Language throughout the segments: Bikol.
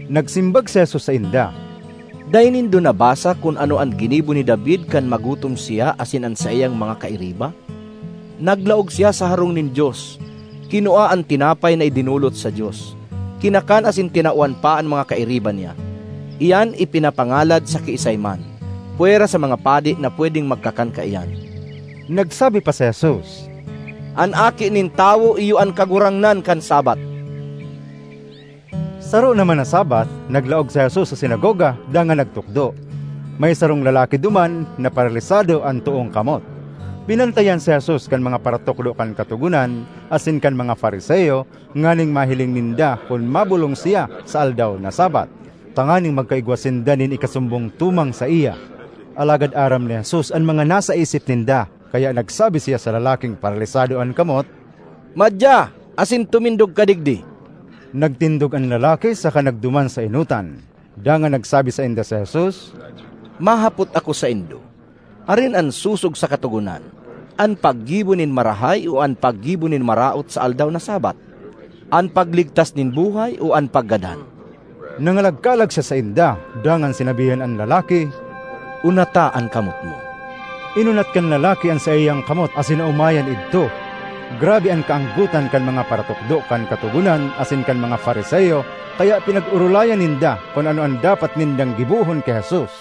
Nagsimbag si Jesus sainda, “Dai nindo nabasa kun ano an ginibo ni David kan magutom siya asin an saiyang mga kairiba? Naglaog siya sa harong nin Dios, kinua an tinapay na idinolot sa Dios, kinakan asin tinawan pa an mga kairiba niya. Iyan ipinapangalad sa kiisay man, pwera sa mga padi na pwedeng magkakan kaiyan.” Nagsabi pa si Jesus, “An Aki nin Tawo iyo an Kagurangnan kan Sabbath.” Saro naman na Sabbath, naglaog si Jesus sa sinagoga dangan nagtukdo. May sarong lalaki duman na paralisado an toong kamot. Binantayan si Jesus kan mga paratukdo kan Katogonan asin kan mga Fariseo nganing mahiling ninda kun mabolong siya sa aldaw na Sabbath, tanganing magkaigwa sinda nin ikasumbong tumang saiya. Alagad aram ni Jesus an mga nasa isip ninda, kaya nagsabi siya sa lalaking paralisado an kamot, “Madya asin tumindog ka digdi.” Nagtindog an lalaki saka nagduman sa enotan. Dangan nagsabi sainda si Jesus, “Mahapot ako saindo: arin an sosog sa Katogonan, an paggibo nin marahay o an paggibo nin maraot sa aldaw na Sabbath? An pagligtas nin buhay o an paggadan?” Nangalagkalag siya sainda, dangan sinabihan an lalaki, “Unata an kamot mo.” Inunat kan lalaki an saiyang kamot asin naomayan idto. Grabe an kaanggotan kan mga paratukdo kan Katogonan asin kan mga Fariseo kaya pinag-orolayan ninda kun ano an dapat nindang gibohon ki Jesus.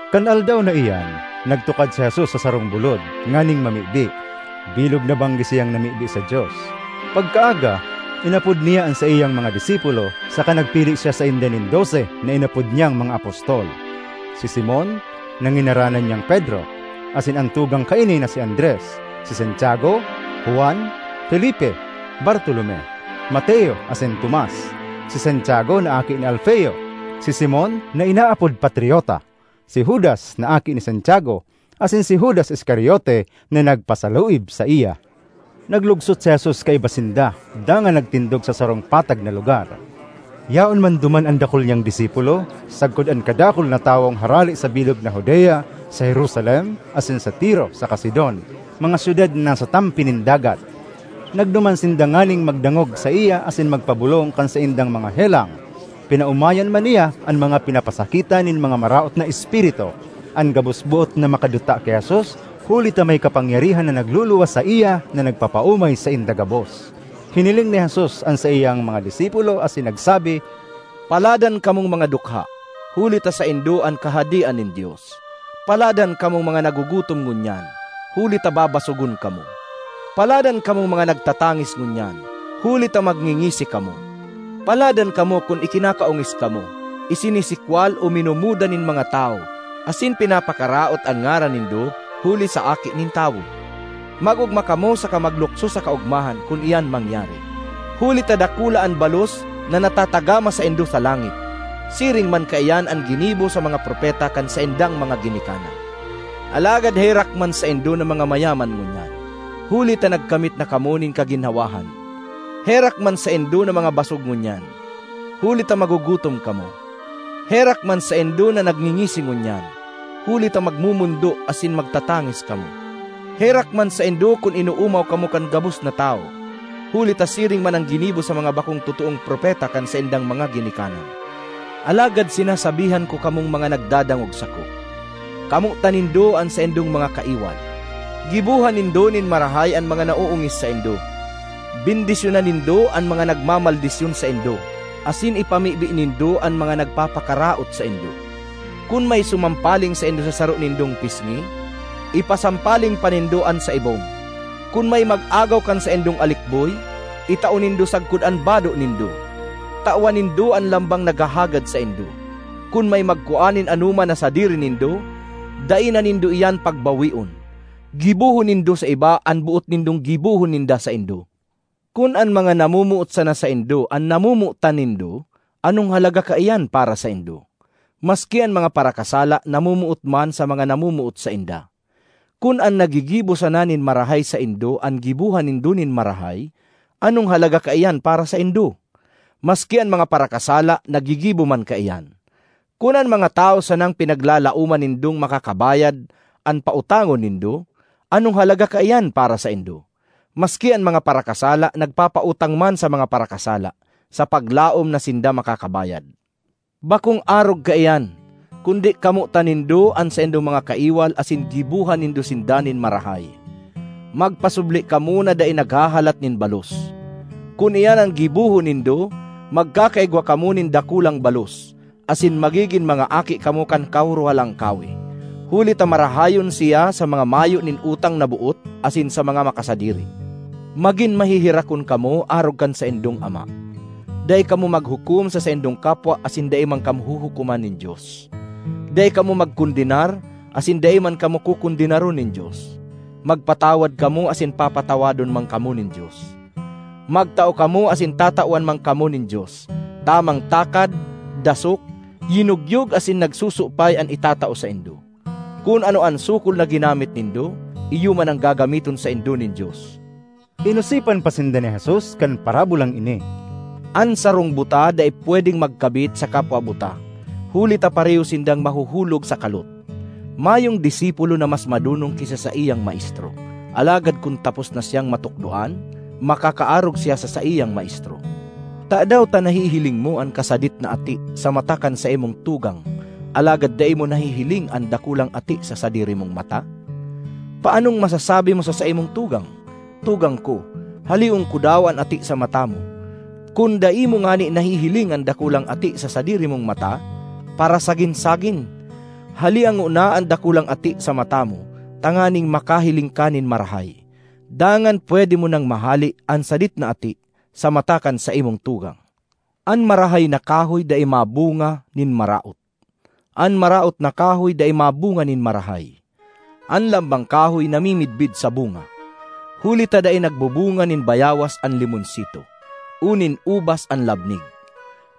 Kan aldaw na iyan, nagtukad si Jesus sa sarong bulod, nganing mamibi; bilog na banggi siyang namibi sa Dios. Pagkaaga, inapod niya an saiyang mga disipulo, saka nagpili siya sainda nin dose na inapod niyang mga apostol: si Simon (na nginaranan niyang Pedro) asin an tugang kaini na si Andres; si Santiago, Juan, Felipe, Bartolome, Mateo asin Tomas; si Santiago na aki ni Alfeo; si Simon (na inaapod Patriota); si Judas na aki ni Santiago; asin si Judas Iscariote, na nagpasaluib saiya. Naglugsot si Jesus kaiba sinda dangan nagtindog sa sarong patag na lugar. Yaon man duman an dakul niyang disipulo, sagkod an kadakul na tawong harale sa bilog na Judea, sa Jerusalem, asin sa Tiro saka Sidon, mga syudad na nasa tampi nin dagat. Nagduman sinda nganing magdangog saiya asin magpabolong kan saindang mga helang. Pinaomayan man niya an mga pinapasakitan nin mga maraot na espiritu. An gabos boot na makaduta ki Jesus huli ta may kapangyarihan na nagluluwas saiya na nagpapaomay sainda gabos. Hiniling ni Jesus an saiyang mga disipulo asin nagsabi, “Paladan kamong mga dukha, huli ta saindo an Kahadean nin Dios! ”Paladan kamong mga nagugutom ngunyan, huli ta babasogon kamo! “Paladan kamong mga nagtatangis ngunyan, huli ta magngingisi kamo! ”Paladan kamo kun ikinakaongis kamo, isinisikwal, o minumuda nin mga tawo, asin pinapakaraot an ngaran nindo huli sa Aki nin Tawo! Mag-ogma kamo saka maglukso sa kaogmahan kun iyan mangyari, huli ta dakula an balos na natatagama saindo sa langit. Siring man kaiyan an ginibo sa mga propeta kan saindang mga ginikanan. ”Alagad herak man saindo na mga mayaman ngunyan, huli ta nagkamit na kamo nin kaginhawahan! ”Herak man saindo na mga basog ngunyan, huli ta magugutom kamo! “Herak man saindo na nagngingisi ngunyan, huli ta magmomondo asin magtatangis kamo! ”Herak man saindo kun inoomaw kamo kan gabos na tawo, huli ta siring man an ginibo sa mga bakong totoong propeta kan saindang mga ginikanan. ”Alagad sinasabihan ko kamong mga nagdadangog sako: kamotan nindo an saindong mga kaiwal, gibohan nindo nin marahay an mga naoongis saindo, bendisyonan nindo an mga nagmamaldisyon saindo asin ipamibi nindo an mga nagpapakaraot saindo. Kun may sumampaling saindo sa saro nindong pisngi, ipasampaling pa nindo an sa ibong. Kun may mag-agaw kan saindong alikboy, itao nindo sagkod an bado nindo. Tawan nindo an lambang naghahagad saindo. Kun may magkua nin anoman na sadiri nindo, dai na nindo iyan pagbawion. Gibohon nindo sa iba an boot nindong gibohon ninda saindo. ”Kun an mga namomoot sana saindo an namomotan nindo, anong halaga kaiyan para saindo? Maski an mga parakasala namomoot man sa mga namomoot sainda! Kun an naggigibo sana nin marahay saindo an gibohan nindo nin marahay, anong halaga kaiyan para saindo? Maski an mga parakasala naggigibo man kaiyan! Kun an mga tawo sanang pinaglalaoman nindong makakabayad an pautangon nindo, anong halaga kaiyan para saindo? Maski an mga parakasala nagpapautang man sa mga parakasala sa paglaom na sinda makakabayad. Bakong arog kaiyan! Kundi kamotan nindo an saindong mga kaiwal asin gibohan nindo sinda nin marahay. Magpasubli kamo na dai naghahalat nin balos. Kun iyan an gibohon nindo, magkakaigwa kamo nin dakulang balos, asin magigin mga aki kamo kan Kahorohalangkawe. Huli ta marahayon siya sa mga mayo nin utang na boot asin sa mga makasadiri. Magin maheherakon kamo arog kan saindong Ama. ”Dai kamo maghukom sa saindong kapwa asin dai man kamo huhukoman nin Dios. Dai kamo magkondenar, asin dai man kamo kokondenaron nin Dios. Magpatawad kamo asin papatawadon man kamo nin Dios. Magtao kamo asin tatawan man kamo nin Dios; tamang takad, dasok, yinogyog asin nagsusupay an itatao saindo. Kun ano an sukol na ginamit nindo, iyo man an gagamiton saindo nin Dios.” Inosipan pa sinda ni Jesus kan parabolang ini: “An sarong buta dai pwedeng magkabit sa kapwa buta; huli ta pareho sindang mahuhulog sa kalot. Mayong disipulo na mas madonong ki sa saiyang maestro; alagad kun tapos na siyang matukdoan, makakaarog siya sa saiyang maestro. ”Tadaw ta nahihiling mo an kasadit na ati sa mata kan saimong tugang alagad dai mo nahihiling an dakulang ati sa sadiri mong mata? Paanong masasabi mo sa saimong tugang, ‘Tugang ko, haleon ko daw an ati sa mata mo,’ kun dai mo ngani nahihiling an dakulang ati sa sadiri mong mata? Parasagin-sagin! Halea ngona an dakulang ati sa mata mo tanganing makahiling ka nin marahay; dangan pwede mo nang mahale an sadit na ati sa mata kan saimong tugang. ”An marahay na kahoy dai mabunga nin maraot; an maraot na kahoy dai mabunga nin marahay. An lambang kahoy namimidbid sa bunga. Huli ta dai nagbubunga nin bayawas an limonsito o nin ubas an labnig.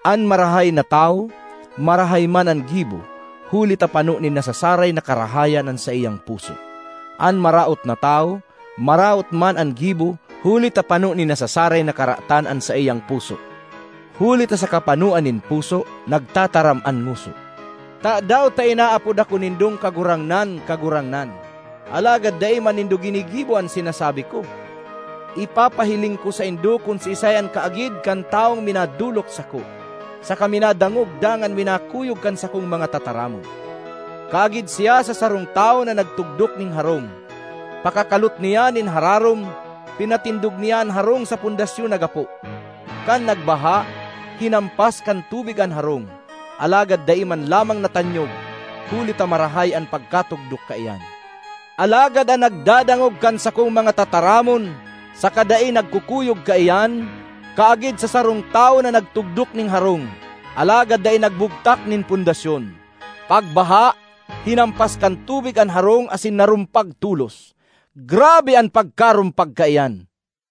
An marahay na tawo, marahay man an gibo huli ta pano nin nasasaray na karahayan an saiyang puso; an maraot na tawo, maraot man an gibo huli ta pano nin nasasaray na karatan an saiyang puso. Huli ta sa kapanoan nin puso, nagtataram an ngoso. ”Tadaw ta inaapod ako nindong ‘Kagurangnan, Kagurangnan,’ alagad dai man nindo ginigibo an sinasabi ko? Ipapahiling ko saindo kun siisay an kaagid kan tawong minadolok sako, saka minadangog dangan minakuyog kan sakong mga tataramon. Kaagid siya sa sarong tawo na nagtugdok nin harong: pakakalot niya nin hararom, pinatindog niya an harong sa pundasyon na gapo. Kan nagbaha, hinampas kan tubig an harong, alagad dai man lamang natanyog huli ta marahay an pagkatugdok kaiyan. Alagad an nagdadangog kan sakong mga tataramon saka dai nagkukuyog kaiyan, kaagid sa sarong tawo na nagtugdok nin harong alagad dai nagbugtak nin pundasyon. Pagbaha, hinampas kan tubig an harong asin narumpag tolos—grabe an pagkarumpag kaiyan!”